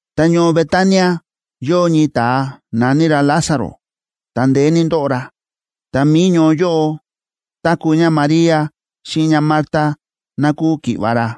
Ta ñoo Betania yóo ñii ta̱a na̱ní ra Lázaro, ta ndeé ní ndóꞌo ra. Ta mi̱i ñoo yóꞌo táku̱ ñáMaría xíꞌin ñáMarta, ná kúu ki̱ꞌva̱ ra.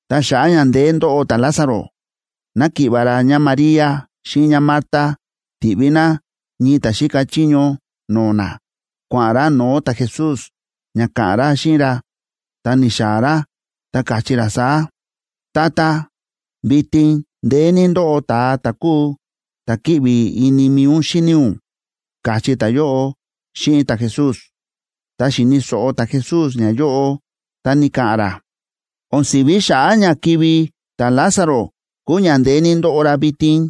Ta xa̱ꞌa̱ ña ndeé ndóꞌo ta̱Lázaro, náki̱ꞌva̱ ra ñáMaría xíꞌin ñáMarta ti̱ꞌví ná ñii ta̱ xíka chiño no̱o̱ ná, kua̱ꞌa̱n ra no̱o̱ ta̱Jesús, ña ka̱ꞌa̱n ra xíꞌin ra. Ta ni̱xaa̱ ra, ta káchí ra saá: ―Tata, vitin ndeé ní ndóꞌo ta̱a ta̱ kúu ta̱ kíꞌvi ini mi̱i ún xíni ún ―káchí ta̱yóꞌo xíꞌin ta̱Jesús. Tá xi̱ni̱ so̱ꞌo ta̱Jesús ñayóꞌo, ta ni̱ka̱ꞌa̱n ra: ―O̱n si̱ví xa̱ꞌa̱ ña kivi̱ ta̱Lázaro kúu ña ndeé ní ndóꞌo ra vitin.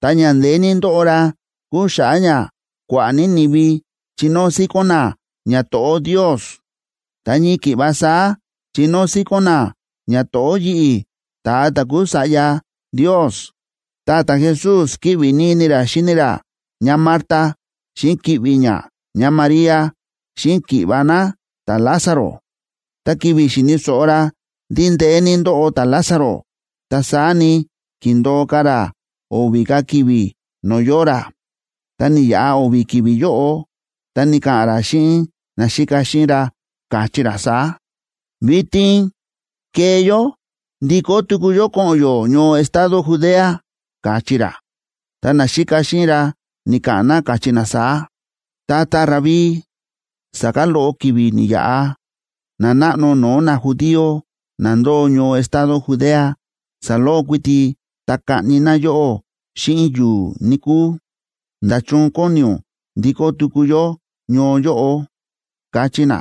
Ta ña ndeé ní ndóꞌo ra kúu xa̱ꞌa̱ ña kua̱ꞌa̱ ní ni̱vi chinóo síkón na ñato̱ꞌó Ndios, ta ñii ki̱ꞌva saá chinóo síkón na ñato̱ꞌó yi̱ꞌi̱, ta̱a ta̱ kúu Sa̱ꞌya Ndios. Ta ta̱Jesús kíꞌvi ní ini ra xíni ra ñáMarta xíꞌin ki̱ꞌvi̱ ñá ñáMaría, xíꞌin ki̱ꞌva̱ ná ta̱Lázaro. Ta ki̱vi̱ xi̱ni̱ so̱ꞌo ra ndí ndeé ní ndóꞌo ta̱Lázaro, ta saá ni, ki̱ndo̱o ka̱ ra o̱vi̱ ka̱ ki̱vi̱ no̱o̱ yóo ra. Tá ni̱yaꞌa o̱vi̱ ki̱vi̱ yóꞌo, ta ni̱ka̱ꞌa̱n ra xíꞌin naxíka xíꞌin ra, káchí ra saá: ―Vitin kee yó ndikó tuku yó ko̱ꞌo̱n yó ñoo estado Judea ―káchí ra. Ta naxíka xíꞌin ra ni̱ka̱ꞌa̱n na, káchí na saá: ―Tata Rabí, sa̱kán loꞌo ki̱vi̱ ni̱yaꞌa, nanáꞌno no̱o̱ najudío na ndóo ñoo estado Judea, saloꞌo kuiti, ta kaꞌni na yóꞌó xíꞌin yu̱u̱, níkúu. ¿Nda̱chun kóni ún ndikó tuku yó ñoo yóꞌo? ―káchí na.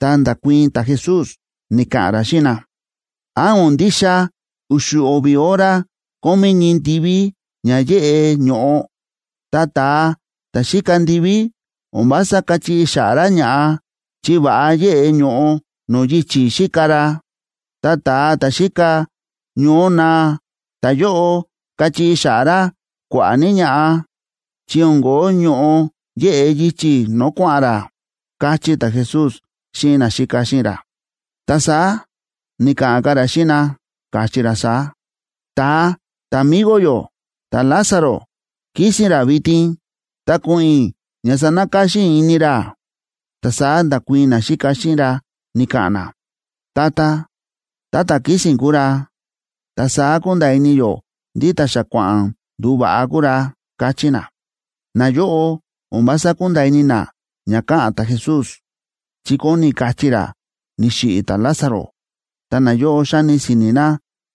Ta nda̱kuii̱n ta̱Jesús, ni̱ka̱ꞌa̱n ra xíꞌin na: ―¿Án o̱n ndixa u̱xu̱ o̱vi̱ hora kómí ñii ndiví ña yéꞌe ño̱ꞌo? Ta ta̱a ta̱ xíka ndiví, o̱n vása káchiꞌi xa̱ꞌa̱ ra ña̱ꞌa, chi va̱ꞌa yéꞌe ño̱ꞌo no̱o̱ yichi̱ xíka ra. Ta ta̱a ta̱ xíka ñoó naa, ta̱yóꞌo káchiꞌi xa̱ꞌa̱ ra kua̱ꞌa̱ ní ña̱ꞌa, chi o̱n ko̱ó ño̱ꞌo yeꞌe yichi̱ no̱o̱ kua̱ꞌa̱n ra ―káchí ta̱Jesús xíꞌin naxíka xíꞌin ra. Ta saá ni̱ka̱ꞌa̱n ka̱ ra xíꞌin na, káchí ra saá: ―Ta̱a ta̱migo yó ta̱Lázaro kísi̱n ra vitin, ta ko̱ꞌo̱n i̱ ña sanakáxín i̱ ini ra. Ta saá nda̱kuii̱n naxíka xíꞌin ra, ni̱ka̱ꞌa̱n na: ―Tata, tá ta̱ kísi̱n kúu ra, ta saá kúnda̱a̱ ini yó ndí ta̱ xa kua̱ꞌa̱n nduva̱ꞌa kúu ra ―káchí na. Nayóꞌo o̱n vása kúnda̱a̱ ini na ña káꞌa̱n ta̱Jesús, chi kóni kachí ra ni̱xiꞌi̱ ta̱Lázaro, ta nayóꞌo xáni si̱ni̱ na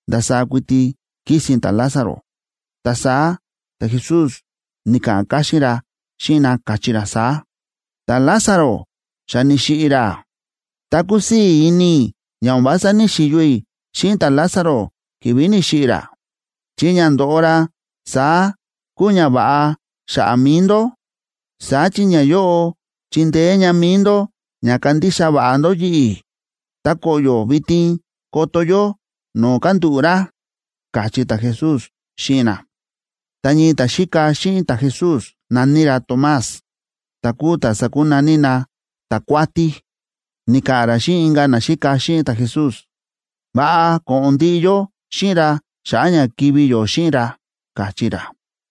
ndasaá kuiti kísi̱n ta̱Lázaro. Ta saá ta̱Jesús ni̱ka̱ꞌa̱n káxín ra xíꞌin na, káchí ra saá: ―Ta̱Lázaro xa ni̱xiꞌi̱ ra. Ta kúsii̱ ini i̱ ña o̱n vása ní‑xiyo i̱ xíꞌin ta̱Lázaro ki̱vi̱ ni̱xiꞌi̱ ra, chi ña ndóꞌo ra saá kúu ñava̱ꞌa xa̱ꞌa̱ mi̱i ndó. Saá chi ñayóꞌo chindeé ña mi̱i ndó ña kandixa va̱ꞌa ndó yi̱ꞌi̱. Ta koꞌyo̱ vitin koto yó no̱o̱ kándúꞌu̱ ra ―káchí ta̱Jesús xíꞌin na. Ta ñii ta̱xíka xíꞌin ta̱Jesús na̱ní ra Tomás, ta̱ kúu ta̱ sa̱kunaní na Ta̱kuátí, ni̱ka̱ꞌa̱n ra xíꞌin inka̱ naxíka xíꞌin ta̱Jesús: ―Va̱ꞌa ko̱ꞌo̱n ndiꞌi yó xíꞌin ra xa̱ꞌa̱ ña kivi̱ yó xíꞌin ra ―káchí ra.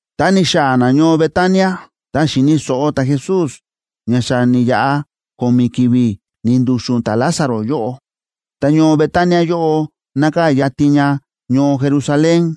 Tá ni̱xaa̱ na ñoo Betania, ta xi̱ni̱ so̱ꞌo ta̱Jesús ña xa ni̱yaꞌa ko̱mi̱ ki̱vi̱ ni̱ndu̱xu̱n ta̱Lázaro yóꞌo. Ta ñoo Betania yóꞌo nákaa̱ yatin ña ñoo Jerusalén,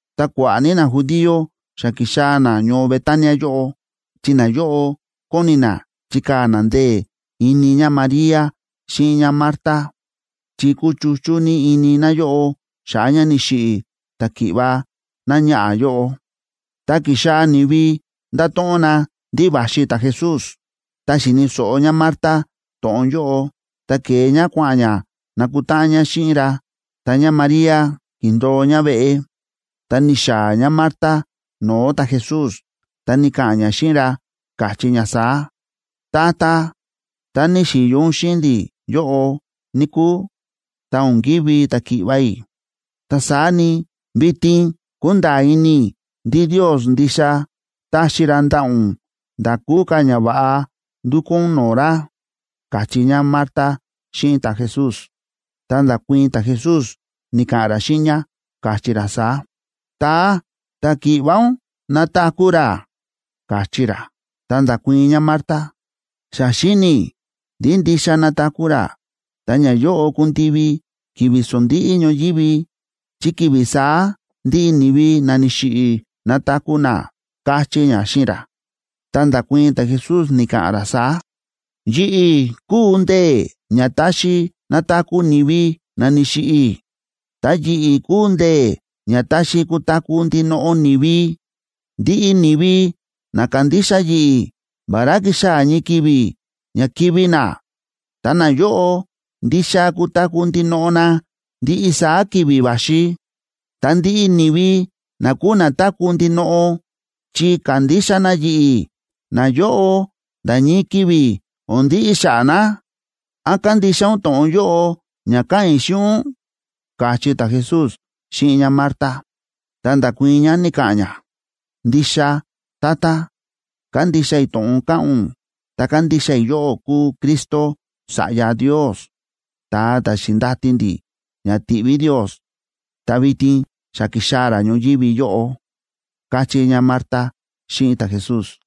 Ta kua̱ꞌa̱ ní najudío xa ki̱xaa̱ na ñoo Betania yóꞌo, chi nayóꞌo kóni na chikaa̱ na ndee̱ ini ñáMaría xíꞌin ñáMarta, chi kúchuchú ní ini náyóꞌo xa̱ꞌa̱ ña ni̱xiꞌi̱ ta̱ki̱ꞌva̱ náñaꞌa̱ yóꞌo. Tá ki̱xaa̱ ni̱vi nda̱to̱ꞌon na ndí va̱xi ta̱Jesús, ta xi̱ni̱ so̱ꞌo ñáMarta to̱ꞌon yóꞌo, ta ke̱e ñá kua̱ꞌa̱n ñá nakutáꞌan ñá xíꞌin ra. Ta ñáMaría ki̱ndo̱o ñá veꞌe. Ta ni̱xaa̱ ñáMarta no̱o̱ ta̱Jesús, ta ni̱ka̱ꞌa̱n ñá xíꞌin ra, káchí ñá saá: ―Tata, tá ni̱xi̱yo ún xíꞌin ndi̱ yóꞌo, níkúu, ta o̱n kivi̱ ta̱ki̱ꞌva̱ i̱. Ta saá ni, vitin kúnda̱a̱ ini i̱ ndí Ndios ndixa taxi ra ndaꞌa̱ ún nda̱ kúu ka̱ ñava̱ꞌa ndukú ún no̱o̱ ra ―káchí ñáMarta xíꞌin ta̱Jesús. Ta nda̱kuii̱n ta̱Jesús, ni̱ka̱ꞌa̱n ra xíꞌin ñá, káchí ra saá: ―Ta̱a ta̱ki̱ꞌva̱ ún nataku̱ ra ―káchí ra. Ta nda̱kuii̱n ñáMarta: ―Xa xíni̱ i̱ ndí ndixa nataku̱ ra, ta ñayóꞌo kundivi ki̱vi̱ sondíꞌí ñoyívi, chi ki̱vi̱ saá ndiꞌi ni̱vi na ni̱xiꞌi̱ nataku̱ na ―káchí ñá xíꞌin ra. Ta nda̱kuii̱n ta̱Jesús, ni̱ka̱ꞌa̱n ra saá: ―Yi̱ꞌi̱ kúu ndee̱ ña táxi nataku̱ ni̱vi na ni̱xiꞌi̱, ta yi̱ꞌi̱ kúu ndee̱ ña táxi kutaku̱ ndinoꞌo ni̱vi. Ndiꞌi ni̱vi na kándixa yi̱ꞌi̱, vará kixaa̱ ñii ki̱vi̱ ña kivi̱ na, ta nayóꞌo ndixa kutaku̱ ndinoꞌo na ndiꞌi saá ki̱vi̱ va̱xi. Ta ndiꞌi ni̱vi na kúu na táku̱ ndinoꞌo chi kándixa na yi̱ꞌi̱, nayóꞌo nda̱ ñii ki̱vi̱ o̱n ndiꞌi xa̱ꞌa̱ na. ¿Án kándixa ún to̱ꞌon yóꞌo ña káꞌa̱n i̱ xíꞌin ún? ―káchí ta̱Jesús xíꞌin ñáMarta. Ta nda̱kuii̱n ñá, ni̱ka̱ꞌa̱n ñá: ―Ndixa, Tata, kándixa i̱ to̱ꞌon káꞌa̱n ún, ta kándixa i̱ yóꞌó kúu Cristo, Sa̱ꞌya Ndios, ta̱a ta̱ xi̱ndati ndi̱ ña tiꞌví Ndios, ta vitin xa ki̱xaa̱ ra ñoyívi yóꞌo ―káchí ñáMarta xíꞌin ta̱Jesús.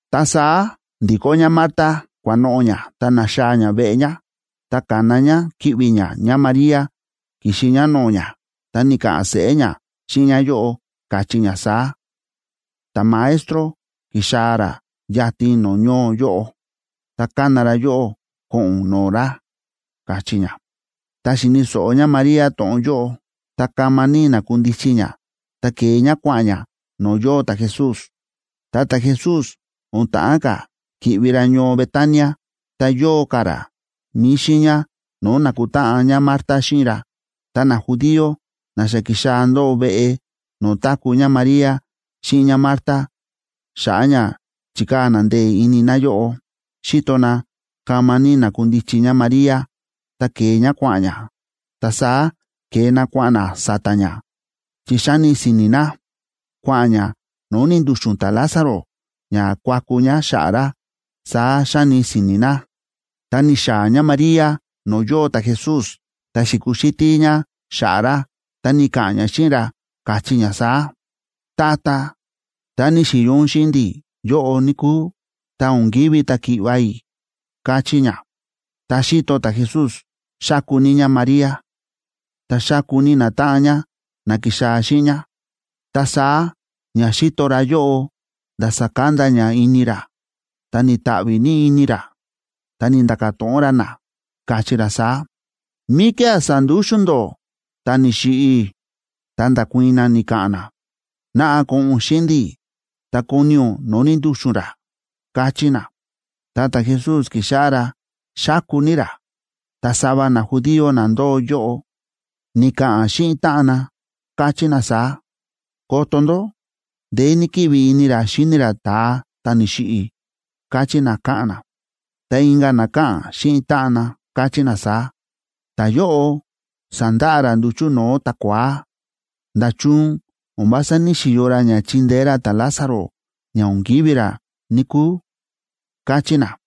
Ta saá ndi̱kó ñáMarta kua̱noꞌo̱ ñá, ta na̱xaa̱ ñá veꞌe ñá. Ta ka̱na ñá ki̱ꞌvi̱ ñá ñáMaría kixi ñá no̱o̱ ñá, ta ni̱ka̱ꞌa̱n seꞌé ñá xíꞌin ñáyóꞌo, káchí ñá saá: ―Ta̱Maestro ki̱xaa̱ ra yatin no̱o̱ ñoo yóꞌo, ta kána ra yóꞌó ko̱ꞌo̱n ún no̱o̱ ra ―káchí ñá. Tá xi̱ni̱ so̱ꞌo ñáMaría to̱ꞌon yóꞌo, ta kama ní na̱kundichi ñá, ta ke̱e ñá kua̱ꞌa̱n ñá no̱o̱ yóo ta̱Jesús. Ta ta̱Jesús o̱n ta̱ꞌán ka̱ ki̱ꞌvi ra ñoo Betania, ta yóo ka̱ ra mi̱i xiiña no̱o̱ na̱kutáꞌan ñáMarta xíꞌin ra. Ta najudío na xa ki̱xaa̱ ndóo veꞌe no̱o̱ táku̱ ñáMaría xíꞌin ñáMarta xa̱ꞌa̱ ña chíkaa̱ na ndee̱ ini náyóꞌo, xi̱to na kama ní na̱kundichi ñáMaría, ta ke̱e ñá kua̱ꞌa̱n ñá, ta saá ke̱e na kua̱ꞌa̱n na sa̱ta̱ ñá, chi xa̱ni si̱ni̱ na: “Kua̱ꞌa̱n ñá no̱o̱ ni̱ndu̱xu̱n ta̱Lázaro ña kuaku ñá xa̱ꞌa̱ ra”, saá xa̱ni si̱ni̱ na. Ta ni̱xaa̱ ñáMaría no̱o̱ yóo ta̱Jesús, ta xi̱kuxítí ñá xa̱ꞌa̱ ra, ta ni̱ka̱ꞌa̱n ñá xíꞌin ra, káchí ñá saá: ―Tata, tá ni̱xi̱yo ún xíꞌin ndi̱ yóꞌo, níkúu, ta o̱n kivi̱ ta̱ki̱ꞌva̱ i̱ ―káchí ñá. Tá xi̱to ta̱Jesús xáku ní ñáMaría, ta xáku ní natáꞌan ñá na ki̱xaa̱ xíꞌin ñá, ta saá ña xíto ra yóꞌo nda̱ sákanda ña ini ra, ta ni̱ta̱ꞌvi̱ ní ini ra. Ta ni̱nda̱ka̱ to̱ꞌon ra na, káchí ra saá: ―¿Míkía̱ sa̱ndúxu̱n ndó ta̱ ni̱xiꞌi̱? Ta nda̱kuii̱n na, ni̱ka̱ꞌa̱n na: ―Naꞌa, ko̱ꞌo̱n ún xíꞌin ndi̱ ta koni ún no̱o̱ ni̱ndu̱xu̱n ra ―káchí na. Ta ta̱Jesús ki̱xáꞌá ra xáku ní ra. Ta sava najudío na ndóo yóꞌo, ni̱ka̱ꞌa̱n xíꞌin táꞌan na, káchí na saá: ―Koto ndó, ndeé ní kíꞌvi ini ra xi̱ni ra ta̱a ta̱ ni̱xiꞌi̱ ―káchí na, káꞌa̱n na. Ta inka̱ na káꞌa̱n xíꞌin táꞌan na, káchí na saá: ―Ta̱yóꞌo sa̱ndaꞌa ra nduchu̱ no̱o̱ ta̱kua̱á. ¿Nda̱chun o̱n vása ní‑xiyo ra ña chíndeé ra ta̱Lázaro ña o̱n kivi̱ ra, níkúu? ―káchí na.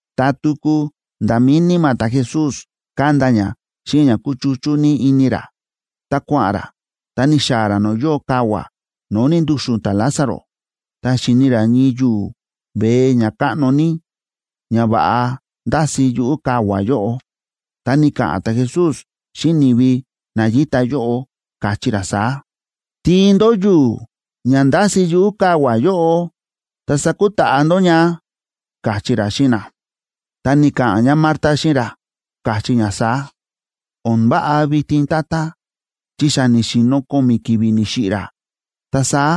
Ta tuku nda̱ mi̱i níma̱ ta̱Jesús kánda ña xíꞌin ña kúchuchú ní ini ra, ta kua̱ꞌa̱n ra, ta ni̱xaa̱ ra no̱o̱ yóo kavua̱ no̱o̱ ni̱ndu̱xu̱n ta̱Lázaro. Ta xi̱ni ra ñii yu̱u̱ veé ña káꞌno ní, ña va̱ꞌa ndási yuꞌu̱ kavua̱ yóꞌo. Ta ni̱ka̱ꞌa̱n ta̱Jesús xíꞌin ni̱vi na yíta yóꞌo, káchí ra saá: ―Tiin ndó yu̱u̱ ña ndási̱ yuꞌu̱ kavua̱ yóꞌo, ta sakutaꞌa ndó ña ―káchí ra xíꞌin na. Ta ni̱ka̱ꞌa̱n ñáMarta xíꞌin ra, káchí ñá saá: ―O̱n váꞌa vitin, Tata, chi xa ni̱xi̱no̱ ko̱mi̱ ki̱vi̱ ni̱xiꞌi̱ ra, ta saá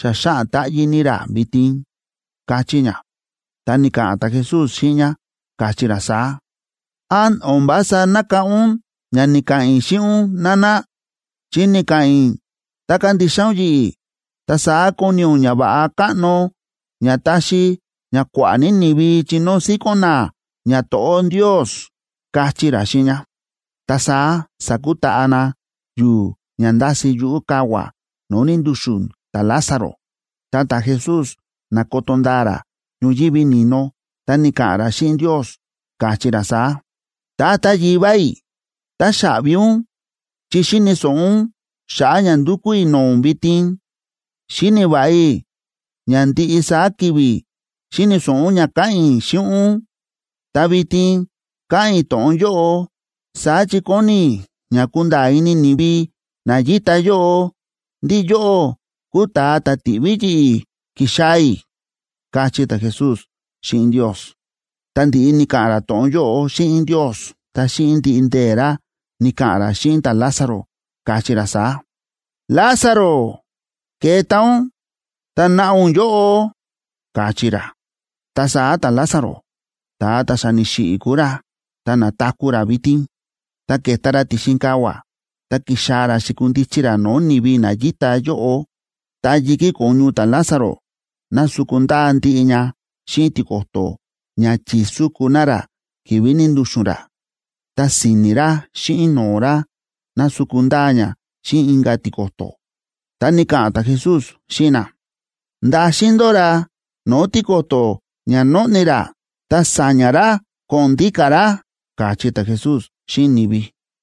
xa xáꞌan táꞌyí ní ra vitin ―káchí ñá. Ta ni̱ka̱ꞌa̱n ta̱Jesús xíꞌin ñá, káchí ra saá: ―¿Án o̱n vása nákáꞌán ún ña ni̱ka̱ꞌa̱n i̱ xíꞌin ún, nana? Chi ni̱ka̱ꞌa̱n i̱ tá kandixa ún yi̱ꞌi̱, ta saá koni ún ñava̱ꞌa káꞌno ña táxi ña kua̱ꞌa̱ ní ni̱vi chinóo síkón na ñato̱ꞌó Ndios ―káchí ra xíꞌin ñá. Ta saá sa̱kutaꞌa na yu̱u̱ ña ndási̱ yuꞌu̱ kavua̱ no̱o̱ ni̱ndu̱xu̱n ta̱Lázaro. Ta ta̱Jesús na̱koto ndaa ra ñoyívi ni̱no, ta ni̱ka̱ꞌa̱n ra xíꞌin Ndios, káchí ra saá: ―Tata Yivá i̱, táxaꞌvi ún chi xíni̱ so̱ꞌo ún xa̱ꞌa̱ ña ndúkú i̱ no̱o̱ ún vitin. Xíni̱ va̱ꞌa i̱ ña ndiꞌi saá ki̱vi̱ xíni̱ so̱ꞌo ún ña káꞌa̱n i̱ xíꞌin ún, ta vitin káꞌa̱n i̱ to̱ꞌon yóꞌo, saá chi kóni i̱ ña kunda̱a̱ ini ni̱vi na yíta yóꞌo ndí yóꞌó kúu ta̱a ta̱ ti̱ꞌví yi̱ꞌi̱ ki̱xaa̱ i̱ ―káchí ta̱Jesús xíꞌin Ndios. Ta ndi̱ꞌi ni̱ka̱ꞌa̱n ra to̱ꞌon yóꞌo xíꞌin Ndios, ta xíꞌin ndiꞌi ndee̱ ra ni̱ka̱ꞌa̱n ra xíꞌin ta̱Lázaro, káchí ra saá: ―Lázaro, keta ún, ta naꞌa ún yóꞌo ―káchí ra. Ta saá ta̱Lázaro, ta̱a ta̱ xa ni̱xiꞌi̱ kúu ra, ta na̱taku̱ ra vitin, ta ke̱ta ra ti̱xin kavua̱, ta ki̱xaa̱ ra xi̱kundichi ra no̱o̱ ni̱vi na yíta yóꞌo. Ta yi̱kí ko̱ñu ta̱Lázaro násuku ndaa ndiꞌi ña xíꞌin tiko̱to̱ ña chi̱súku na ra ki̱vi̱ ni̱ndu̱xu̱n ra. Ta si̱ni̱ ra xíꞌin no̱o̱ ra násuku ndaa ña xíꞌin inka̱ tiko̱to̱. Ta ni̱ka̱ꞌa̱n ta̱Jesús xíꞌin na: ―Ndaxin ndó ra no̱o̱ tiko̱to̱ ña nóꞌni ra, ta sa̱ña̱ ra ko̱ꞌo̱n ndíka̱ ra ―káchí ta̱Jesús xíꞌin ni̱vi.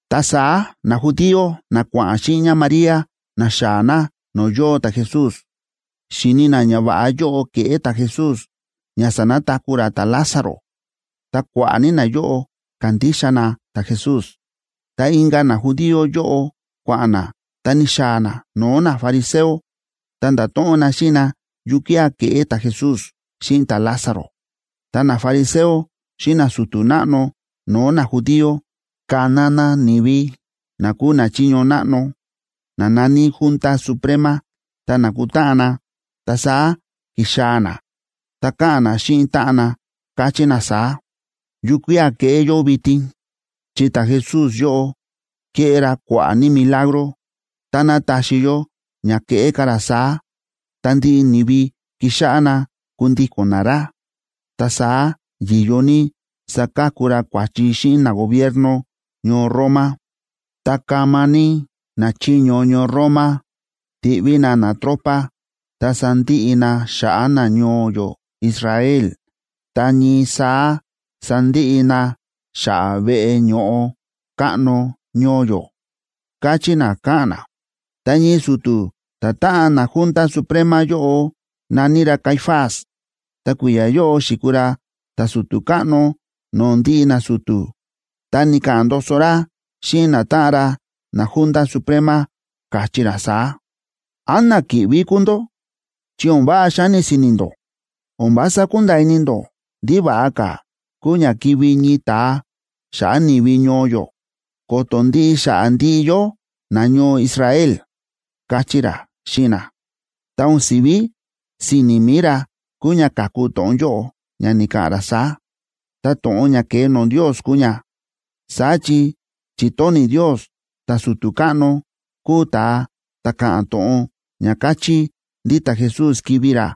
Ta saá najudío, na kua̱ꞌa̱n xíꞌin ñáMaría ni̱xaa̱ na no̱o̱ yóo ta̱Jesús, xi̱ni na ñava̱ꞌa yóꞌo ke̱ꞌé ta̱Jesús ña sa̱nataku̱ ra ta̱Lázaro, ta kua̱ꞌa̱ ní nayóꞌo ka̱ndixa na ta̱Jesús. Ta inka̱ najudío yóꞌo kua̱ꞌa̱n na, ta ni̱xaa̱ na no̱o̱ nafariseo ta nda̱to̱ꞌon na xíꞌin na yukía̱ ke̱ꞌé ta̱Jesús xíꞌin ta̱Lázaro. Ta nafariseo xíꞌin nasu̱tu̱ náꞌno no̱o̱ najudío ka̱na na ni̱vi na kúu nachiño náꞌno, na na̱ní Junta Suprema, ta na̱kutáꞌan na. Ta saá ki̱xaa̱ na, ta káꞌa̱n na xíꞌin táꞌan na, káchí na saá: ―¿Yukía̱ keꞌé yó vitin? Chi ta̱Jesús yóꞌo kéꞌé ra kua̱ꞌa̱ ní milagro. Táná taxi yó ña keꞌé ka̱ ra saá, ta ndiꞌi ni̱vi kixáꞌá na kundíko̱n na ra. Ta saá yi̱yo ní sakaku ra kua̱chi xíꞌin nagobierno ñoo Roma, ta kama ní nachiño ñoo Roma tiꞌví na natropa ta sandiꞌi na xa̱ꞌa̱ nañoo yó Israel, ta ñii saá sandiꞌi na xa̱ꞌa̱ veꞌe ño̱ꞌo káꞌno ñoo yó ―káchí na, káꞌa̱n na. Ta ñii su̱tu̱ ta̱táꞌan naJunta Suprema yóꞌo, na̱ní ra Caifás, ta kui̱ya̱ yóꞌo xi̱kuu ra ta̱su̱tu̱ káꞌno no̱o̱ ndiꞌi nasu̱tu̱, ta ni̱ka̱ꞌa̱n ndoso ra xíꞌin natáꞌan ra naJunta Suprema, káchí ra saá: ―¿Án na kíꞌví kúu ndó?, ¡chi o̱n váꞌa xáni si̱ni̱ ndó! O̱n vása kúnda̱a̱ ini ndó ndí va̱ꞌa ka̱ kúu ña kivi̱ ñii ta̱a xa̱ꞌa̱ ni̱vi ñoo yó, ko̱to̱ ndiꞌi xa̱ꞌa̱ ndiꞌi yó nañoo Israel ―káchí ra xíꞌin na. Ta o̱n si̱ví si̱ni̱ mi̱i ra kúu ña ka̱ku to̱ꞌon yóꞌo ña ni̱ka̱ꞌa̱n ra saá, ta to̱ꞌon ña ke̱e no̱o̱ Ndios kúu ña. Saá chi chi̱tóni̱ Ndios ta̱su̱tu̱ káꞌno kuu ta̱a ta̱ ka̱ꞌa̱n to̱ꞌon ña káchí ndí ta̱Jesús kivi̱ ra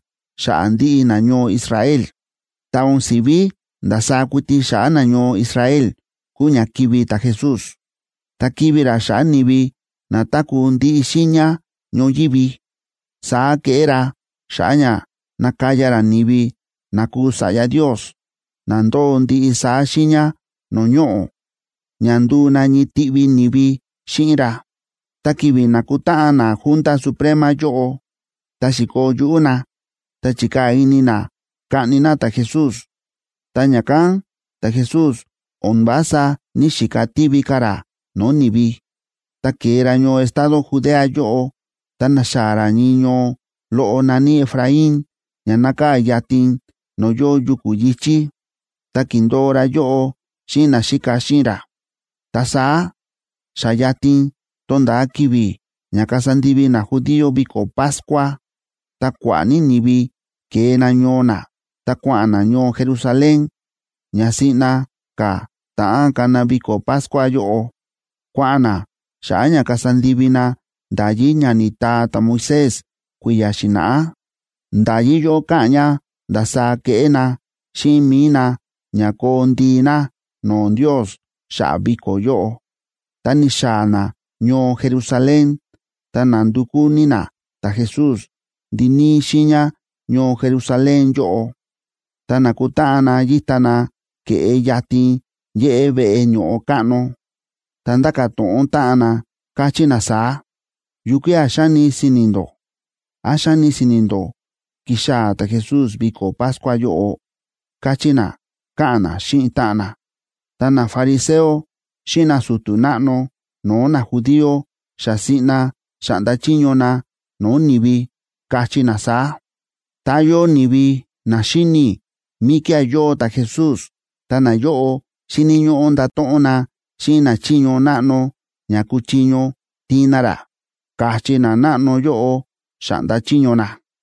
xa̱ꞌa̱ ndiꞌi nañoo Israel. Ta o̱n si̱ví ndasaá kuiti xa̱ꞌa̱ nañoo Israel kúu ña kivi̱ ta̱Jesús, ta kivi̱ ra xa̱ꞌa̱ ni̱vi na táku̱ ndiꞌi xiiña ñoyívi. Saá keꞌé ra xa̱ꞌa̱ ña nakaya ra ni̱vi na kúu sa̱ꞌya Ndios, na ndóo ndiꞌi saá xiiña no̱o̱ ñoꞌo̱, ña nduu na ñii tiꞌvi ni̱vi xíꞌin ra. Ta ki̱vi̱ na̱kutáꞌan naJunta Suprema yóꞌo, ta xi̱koo yuꞌú na, ta chi̱kaa̱ ini na kaꞌni na ta̱Jesús. Ta ña̱kán ta̱Jesús o̱n vása ní‑xika tiví ka̱ ra no̱o̱ ni̱vi, ta ke̱e ra ñoo estado Judea yóꞌo, ta ni̱xaa̱ ra ñii ñoo loꞌo na̱ní Efraín, ña nákaa̱ yatin no̱o̱ yóo yuku̱ yi̱chí. Ta ki̱ndo̱o ra yóꞌo xíꞌin naxíka xíꞌin ra. Ta saá xa yatin tónda̱a ki̱vi̱ ña kasa ndivi najudío viko̱ Pascua.b Ta kua̱ꞌa̱ ní ni̱vi ke̱e na ñoo na, ta kua̱ꞌa̱n na ñoo Jerusalén. Ña siꞌna ka̱ ta̱ꞌán kana viko̱ Pascua yóꞌo, kua̱ꞌa̱n na xa̱ꞌa̱ ña kasa ndivi na nda̱yí ña ni̱taa ta̱Moisés kui̱ya̱ xi̱na̱ꞌá. Nda̱yí yóꞌo káꞌa̱n ña ndasaá keꞌé na xíꞌin mi̱i na ña koo ndii na no̱o̱ Ndios xa̱ꞌa̱ viko̱ yóꞌo. Ta ni̱xaa̱ na ñoo Jerusalén, ta na̱ndukú ní na ta̱Jesús ndiníí xiiña ñoo Jerusalén yóꞌo. Ta na̱kutáꞌan na yíta na ke̱ꞌe yatin yéꞌé veꞌe ño̱ꞌo káꞌno, ta ndáka̱ to̱ꞌon táꞌan na, káchí na saá: ―¿Yukía̱ xáni si̱ni̱ ndó? ¿Án xáni si̱ni̱ ndó kixaa̱ ta̱Jesús viko̱ Pascua yóꞌo? ―káchí na, káꞌa̱n na xíꞌin táꞌan na. Ta nafariseo xíꞌin nasu̱tu̱ náꞌno no̱o̱ najudío xa siꞌna xa̱ꞌnda chiño na no̱o̱ ni̱vi, káchí na saá: ―Tá yóo ni̱vi na xíni̱ míkía̱ yóo ta̱Jesús, ta nayóꞌo xíni̱ ñóꞌó ndato̱ꞌon na xíꞌin nachiño náꞌno ña kuchiño tiin na ra ―káchí nanáꞌno yóꞌo, xa̱ꞌnda chiño na.